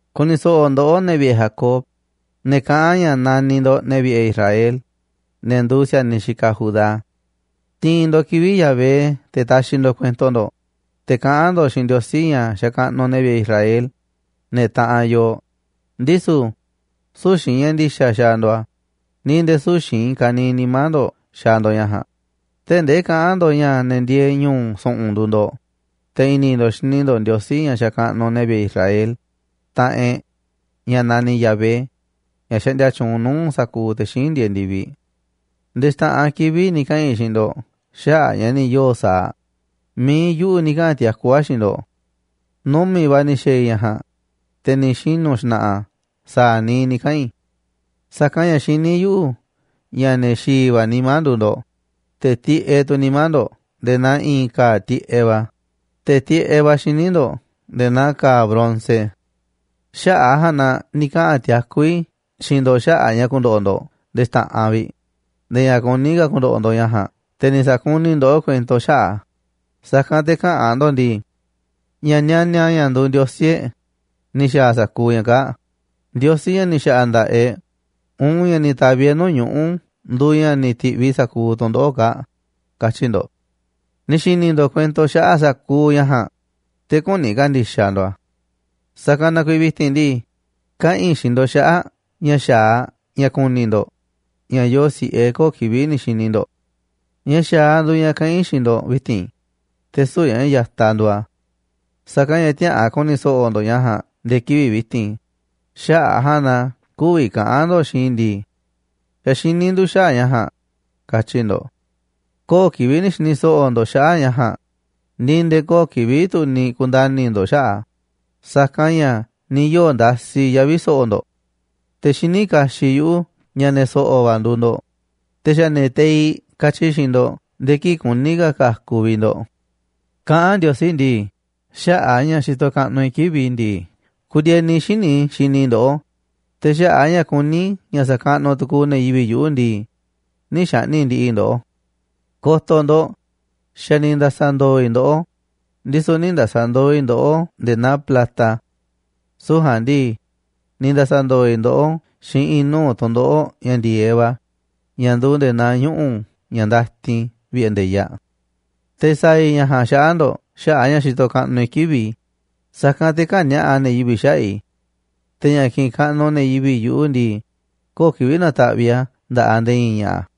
Ku̱ni̱ so̱ꞌo̱ ndoꞌó, ne̱ vi̱ꞌe̱ Jacob, ne̱ kaꞌán ña̱ naniꞌ ndo̱ꞌ ne̱ vi̱ꞌe̱ Israel, ne̱ nduuꞌ si̱a̱niꞌ xikaꞌ Judá. Tiinꞌ ndo̱ꞌ kivi̱ꞌ Yahvé te̱ taxiꞌ ndo̱ꞌ kuento ndo̱ꞌ, te̱ kaꞌán ndo̱ꞌ xiinꞌ Ndiosí, ña̱ xakaꞌnuꞌ ne̱ vi̱ꞌe̱ Israel, ne̱ taꞌanꞌ yooꞌ, ndisu̱ süu̱ꞌ xiinꞌ ña̱ ndi̱xa̱ xaaꞌ ndo̱ꞌ a̱, ni̱ nde̱e̱ süu̱ꞌ xiinꞌ i̱i̱n kaniiꞌ nimá ndo̱ꞌ xaaꞌ ndo̱ꞌ ña̱ ja̱a̱nꞌ, tee̱ꞌ ndee kaꞌán ndo̱ꞌ ña̱ ne̱ ndieeꞌ ñu̱u̱ su̱ꞌu̱n nduuꞌ ndo̱ꞌ, te̱ i̱ni̱ ndo̱ꞌ xini ndo̱ꞌ Ndiosí, ña̱ xakaꞌnuꞌ ne̱ vi̱ꞌe̱ Israel, taꞌanꞌ e̱ꞌ, ña̱ naniꞌ Yahvé, ña̱ xaꞌndia tyuunꞌ nuu̱ꞌ sa̱kuuꞌ te̱ xíinꞌ ndieeꞌ ndi̱viꞌ. “Nde̱e̱ xta̱ꞌanꞌ kivi̱ꞌ ni̱ kaꞌa̱n i̱ xiinꞌ ndo̱ꞌ xaꞌa̱ꞌ ña̱ ni̱ yoo̱ sa̱aꞌ, mi̱iꞌ yuꞌu̱ ni̱ kaꞌa̱n tiakú a̱ xiinꞌ ndo̱ꞌ. Numi̱ꞌ va̱ ni̱ xa̱a̱ i̱ ña̱ ja̱a̱nꞌ, te̱ ni̱ xinu̱ xna̱ꞌa̱ a̱ sa̱a̱ niiꞌ ni̱ kaꞌa̱n i̱. Sa̱kanꞌ ña̱ xiní yuꞌu̱ ña̱ ne̱ xi̱i̱ va̱ nimá nduuꞌ ndo̱ꞌ, te̱ tiꞌeꞌ tu̱ nimá ndo̱ꞌ nde̱e̱ naa i̱i̱n ka̱a̱ tiꞌeꞌ va̱, te̱ tiꞌeꞌ va̱ xíniꞌ ndo̱ꞌ nde̱e̱ naa ka̱a̱ bronce. Xaꞌa̱ꞌ a̱ ja̱a̱nꞌ na ni̱ kaꞌa̱n tiakú i̱ xiinꞌ ndo̱ꞌ xaꞌa̱ꞌ ña̱ ku̱ndo̱ꞌo̱ ndo̱ꞌ nde̱e̱ xta̱ꞌanꞌ vi̱ꞌ, nde̱e̱ ña̱ kuní ka̱ ku̱ndo̱ꞌo̱ ndo̱ꞌ ña̱ ja̱a̱nꞌ. Te̱ ni̱ sakuniꞌ i̱ ndoꞌó kuento xaꞌa̱ꞌ a̱, sa̱kanꞌ te̱ käꞌa̱n ndo̱ꞌ ndii: Ña̱ nianiaꞌ ña̱ nduuꞌ ndiosí e̱ꞌ ni̱ xa̱a̱ sa̱kuuꞌ ña̱ kaa̱ꞌ, ndiosí ña̱ ni̱ xa̱ꞌa̱ nda̱ꞌaꞌ e̱ꞌ, uun ña̱ ni̱ ta̱vi̱ e̱ꞌ nuu̱ꞌ ñuꞌu̱ nduuꞌ ña̱ ni̱ ti̱ꞌviꞌ sa̱kuuꞌ tu̱ndoꞌo̱ꞌ kaa̱ꞌ, katyi̱ ndo̱ꞌ. Ni̱ xi̱ni̱ ndo̱ꞌ kuento xaꞌa̱ꞌ sa̱kuuꞌ ña̱ ja̱a̱nꞌ, te̱ küni ka̱ndi̱xaꞌ ndo̱ꞌ a̱. Sa̱kanꞌ na kuiiꞌ vi̱ti̱n ndii, kaꞌa̱n i̱ xiinꞌ ndo̱ꞌ xaꞌa̱ꞌ ña̱ xa̱aꞌ ña̱ ku̱ni̱ ndo̱ꞌ ña̱ yooꞌ si̱ꞌe köo̱ꞌ kivi̱ꞌ ni̱ xi̱ni̱ ndo̱ꞌ. Ña̱ xa̱aꞌ nduuꞌ ña̱ kaꞌán i̱ xiinꞌ ndo̱ꞌ vi̱ti̱n, te̱ süu̱ꞌ ña̱ ya̱taꞌ nduuꞌ a̱. Sa̱kanꞌ ña̱ tiäꞌa̱an ku̱ni̱ so̱ꞌo̱ ndo̱ꞌ ña̱ ja̱a̱nꞌ nde̱e̱ kivi̱ꞌ vi̱ti̱n. Xaꞌa̱ꞌ a̱ ja̱a̱nꞌ na kü̱vi̱ kaꞌa̱n ndo̱ꞌ xiinꞌ i̱ ndii: Xa̱ xiní ndu̱ xaꞌa̱ꞌ ña̱ ja̱a̱nꞌ, katyi̱ ndo̱ꞌ. Köo̱ꞌ kivi̱ꞌ ni̱ xi̱ni̱ so̱ꞌo̱ ndo̱ꞌ xaꞌa̱ꞌ ña̱ ja̱a̱nꞌ, ni̱ nde̱e̱ köo̱ꞌ kivi̱ꞌ tu̱ ni̱ ku̱nda̱ni̱ ndo̱ꞌ xaꞌa̱ꞌ a̱, sa̱kanꞌ ña̱ ni̱ yoo̱ ndasi yavi̱ so̱ꞌo̱ ndo̱ꞌ. Te̱ xiní kaxiꞌ yuꞌu̱ ña̱ ne̱ so̱ꞌo̱ va̱ nduuꞌ ndo̱ꞌ, te̱ xa̱ ne̱ teiꞌ katyi i̱ xiinꞌ ndo̱ꞌ nde̱e̱ kii̱ꞌ kuní ka̱ ka̱ku̱ vi̱ꞌ ndo̱ꞌ.” Kaꞌán ka̱ Ndiosí ndii: “Xaꞌa̱ꞌ a̱ ña̱ xitoꞌ kaꞌnuꞌ i̱ kivi̱ꞌ i̱ ndii, ku̱ndi̱e̱ni xíniꞌ i̱ xini i̱ ndoꞌó, te̱ xaꞌa̱ꞌ a̱ ña̱ kuní i̱ ña̱ sa̱kaꞌnuꞌ tu̱ku̱u̱ ne̱ yivi̱ꞌ yuꞌu̱ ndii, nï̱ xa̱ꞌni̱ꞌ ndi̱ꞌi̱ i̱ ndoꞌó. Ko̱to̱ ndo̱ꞌ, xa̱ ni̱ nda̱sa̱ ndo̱o̱ i̱ ndoꞌó, ndisu̱ nï̱ nda̱sa̱ ndo̱o̱ i̱ ndoꞌó nde̱e̱ naa plata. Süu̱ꞌ ja̱a̱nꞌ ndii, ni̱ nda̱sa̱ ndo̱o̱ i̱ ndoꞌó xiinꞌ i̱i̱n nuu̱ꞌ tu̱ndoꞌo̱ꞌ ña̱ ndi̱e̱eꞌ va̱ ña̱ nduuꞌ nde̱e̱ naa ñuꞌu̱ ña̱ ndatin vi̱ꞌe̱ nde̱yaꞌ. Te̱ sa̱a̱ i̱ ña̱ ja̱a̱nꞌ xaꞌa̱ꞌ ndo̱ꞌ xaꞌa̱ꞌ a̱ ña̱ xitoꞌ kaꞌnuꞌ i̱ kivi̱ꞌ i̱, sa̱kanꞌ te̱ kä̱ni̱a̱ꞌa ne̱ yivi̱ꞌ xaꞌa̱ꞌ i̱. Te̱ ña̱ kiꞌinꞌ kaꞌnuꞌ ne̱ yivi̱ꞌ yuꞌu̱ ndii, köo̱ꞌ kivi̱ꞌ na̱ta̱ꞌviꞌ i̱ a̱ nda̱ꞌaꞌ nde̱e̱ i̱i̱n ña̱ꞌa̱.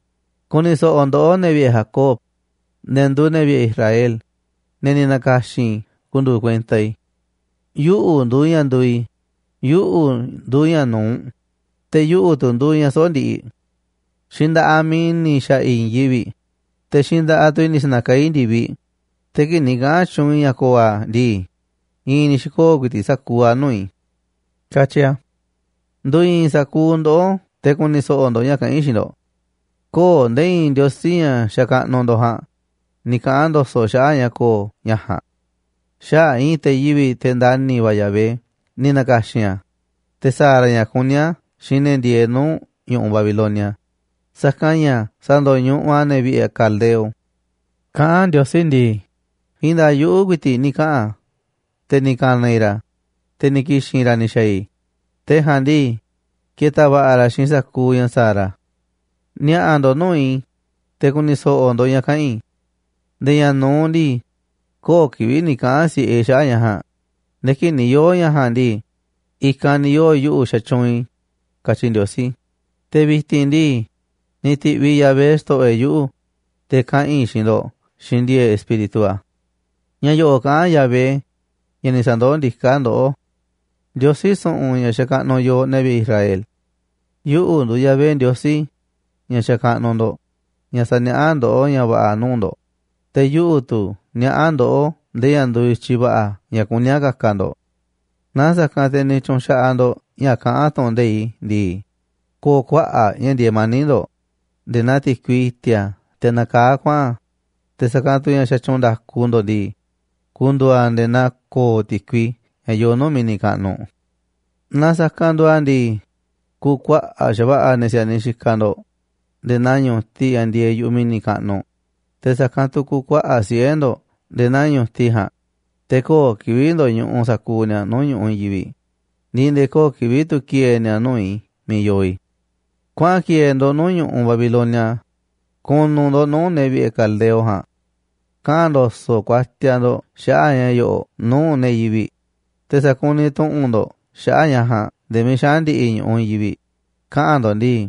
’Ku̱ni̱ so̱ꞌo̱ ndoꞌó, ne̱ vi̱ꞌe̱ Jacob, ne̱ nduuꞌ ne̱ vi̱ꞌe̱ Israel, ne̱ ni̱ na̱ka̱xi̱n i̱ ku̱ndu̱u̱ kuenta i̱. Yuꞌu̱ nduuꞌ ña̱ nduuꞌ i̱. Yuꞌu̱ nduuꞌ ña̱ nu̱uꞌ, te̱ yuꞌu̱ tu̱ nduuꞌ ña̱ soꞌo̱ꞌ ndiꞌiꞌ. Xiinꞌ nda̱ꞌaꞌ mi̱iꞌ i̱ ni̱ xa̱ꞌa̱ i̱i̱n yivi̱ꞌ, te̱ xiinꞌ nda̱ꞌaꞌ tu̱ i̱ ni̱ sa̱na̱kaá i̱ ndi̱viꞌ. Te̱ kii̱ꞌ ni̱ kaꞌa̱n tyuunꞌ i̱ ña̱ ko̱o̱ a̱ ndii, i̱i̱n ni̱ xi̱koo̱ ku̱i̱ti̱ꞌ sa̱kuuꞌ a̱ nuu̱ꞌ i̱”, katyi a̱. Ndu̱i̱i̱n sa̱kuuꞌ ndoꞌó te̱ ku̱ni̱ so̱ꞌo̱ ndo̱ꞌ ña̱ kaꞌán i̱ xiinꞌ ndo̱ꞌ: Kö̱o̱ꞌ nde̱e̱ i̱i̱n ndiosí, ña̱ xakaꞌnuꞌ ndo̱ꞌ ja̱a̱nꞌ, ni̱ kaꞌa̱n ndo̱so̱ꞌ xaꞌa̱ꞌ ña̱ ko̱o̱ ña̱ ja̱a̱nꞌ. Xaꞌa̱ꞌ i̱i̱n te̱ yivi̱ꞌ, te̱ ndani̱ va̱ Yahvé, ni̱ na̱ka̱xi̱n a̱, te̱ sa̱a̱ ra̱ ña̱ kuní a̱ xiinꞌ ne̱ ndieeꞌ nuu̱ꞌ ñu̱ꞌuꞌ Babilonia, sa̱kanꞌ ña̱ sa̱ndo̱ñuꞌuꞌ a̱ ne̱ vi̱ꞌe̱ caldeo. Kaꞌán Ndiosí ndii: “I̱i̱n nda̱a̱ꞌ yuꞌu̱ ku̱i̱ti̱ꞌ ni̱ kaꞌa̱n, te̱ ni̱ ka̱na̱ i̱ ra̱, te̱ ni̱ ki̱xi̱n ra̱ ni̱ xa̱a̱ i̱, te̱ ja̱a̱nꞌ ndii, ke̱ta̱ va̱ꞌa̱ ra̱ xiinꞌ sa̱kuuꞌ ña̱ sa̱a̱ ra̱. Ni̱a̱ꞌa̱ ndo̱ꞌ nuu̱ꞌ i̱, te̱ ku̱ni̱ so̱ꞌo̱ ndo̱ꞌ ña̱ kaꞌa̱n i̱. Nde̱e̱ ña̱ nu̱uꞌ ndii, köo̱ꞌ kivi̱ꞌ ni̱ kaꞌa̱n si̱ꞌe i̱ xaꞌa̱ꞌ ña̱ ja̱a̱nꞌ nde̱e̱ kii̱ꞌ ni̱ yoo̱ ña̱ ja̱a̱nꞌ ndii, i̱kanꞌ ni̱ yoo̱ yuꞌu̱ xatyuunꞌ i̱”, katyi Ndiosí. Te̱ vi̱ti̱n ndii, ni̱ ti̱ꞌviꞌ Yahvé, Xto̱ꞌo̱ e̱ꞌ, yuꞌu̱, te̱ kaꞌa̱n i̱ xiinꞌ ndo̱ꞌ xiinꞌ ndi̱e̱e̱ꞌ Espíritu a̱. Ña̱ yo̱ꞌo̱ꞌ kaꞌán Yahvé, ña̱ ni̱ sa̱ndoó ndiká ndoꞌó, Ndiosí su̱ꞌu̱n ña̱ xakaꞌnuꞌ yooꞌ, ne̱ vi̱ꞌe̱ Israel: “Yuꞌu̱ nduuꞌ Yahvé, Ndiosí ña̱ xakaꞌnuꞌ ndo̱ꞌ, ña̱ saniaꞌá ndoꞌó ña̱ va̱ꞌa̱ nuu̱ꞌ ndo̱ꞌ, te̱ yuꞌu̱ tu̱ niaꞌá ndoꞌó ndee ña̱ nduuꞌ i̱tyiꞌ va̱ꞌa̱ ña̱ kuní a̱ ka̱ka̱ ndo̱ꞌ. Naa sa̱kanꞌ te̱ ni̱ tyu̱nxaꞌaꞌ ndo̱ꞌ ña̱ kaꞌán tu̱ꞌu̱n nde̱iꞌ i̱ ndii, ko̱o̱ kuaꞌa̱ꞌ ña̱ ndieeꞌ mani̱ꞌ ndo̱ꞌ, nde̱e̱ naa ti̱kui i̱ti̱a̱ teꞌ nakaá kuaꞌa̱n, te̱ sa̱kanꞌ tu̱ ña̱ xatyuunꞌ nda̱ku ndo̱ꞌ ndii, ku̱ndu̱u̱ a̱ nde̱e̱ naa ko̱o̱ ti̱kui ña̱ yoo nuu̱ꞌ mi̱ni̱ kaꞌnuꞌ. Naaꞌ sa̱kanꞌ nduuꞌ a̱ ndii, ku̱kuaꞌa̱ꞌ xa̱va̱ꞌa̱ ne̱ si̱a̱niꞌ xikaꞌ ndo̱ꞌ nde̱e̱ naa ñu̱tiꞌ ña̱ ndieeꞌ yu̱ꞌuꞌ mi̱ni̱ kaꞌnuꞌ, te̱ sa̱kanꞌ tu̱ ku̱kuaꞌa̱ꞌ siꞌe̱ ndo̱ꞌ nde̱e̱ naa ñu̱tiꞌ ja̱a̱nꞌ. Te̱ köo̱ꞌ kivi̱ꞌ ndo̱ñuꞌuꞌ sa̱kuuꞌ ni̱a̱ nuu̱ꞌ ñu̱ꞌuꞌ i̱i̱n yivi̱ꞌ ni̱ nde̱e̱ köo̱ꞌ kivi̱ꞌ tu̱ ki̱e̱e̱ ni̱a̱ nuu̱ꞌ i̱ miiꞌ yoo i̱. ’Kuaꞌa̱n ki̱e̱e̱ ndo̱ꞌ nuu̱ꞌ ñu̱ꞌuꞌ Babilonia. Ku̱nu̱ ndo̱ꞌ nuu̱ꞌ ne̱ vi̱ꞌe̱ caldeo ja̱a̱nꞌ. Kaꞌa̱n ndo̱so̱ꞌ kuatiaꞌ ndo̱ꞌ xaꞌa̱ꞌ ña̱ yo̱ꞌo̱ꞌ nuu̱ꞌ ne̱ yivi̱ꞌ, te̱ sa̱kuniꞌ tu̱ꞌu̱n ndo̱ꞌ xaꞌa̱ꞌ ña̱ ja̱a̱nꞌ nde̱e̱ miiꞌ xaꞌa̱n ndi̱ꞌi̱ ñu̱ꞌuꞌ i̱i̱n yivi̱ꞌ, kaꞌa̱n ndo̱ꞌ ndii: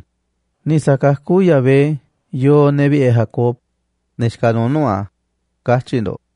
¡Ni̱ sa̱kakú Yahvé ne̱ vi̱ꞌe̱ Jacob, ne̱ xikaꞌ nuuꞌ nuu̱ꞌ a̱!, katyi̱ ndo̱ꞌ.”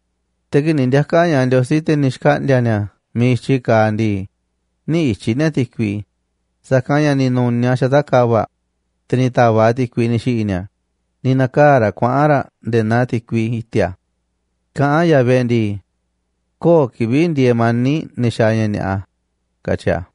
Te̱ kii̱ꞌ ni̱ ndiaka̱ ña̱ꞌaꞌ Ndiosí, te̱ ni̱ xkaꞌndi̱a̱ ni̱a̱ miiꞌ i̱tyiꞌ kaaꞌ ndii, nï̱ ityi̱ ni̱a̱ ti̱kui, sa̱kanꞌ ña̱ ni̱ nu̱niaꞌ a̱ xata̱ꞌ ka̱va̱ꞌ, te̱ ni̱ ta̱va̱ꞌ a̱ ti̱kui ni̱ xi̱ꞌi̱ ni̱a̱, ni̱ na̱kaa̱ raꞌ kuaꞌa̱n raꞌ nde̱e̱ naa ti̱kui i̱ti̱a̱. Kaꞌán Yahvé ndii: “Köo̱ꞌ kivi̱ꞌ ndieeꞌ mani̱ꞌ ne̱ xaaꞌ ña̱ ni̱a̱ꞌa”, katyi a̱.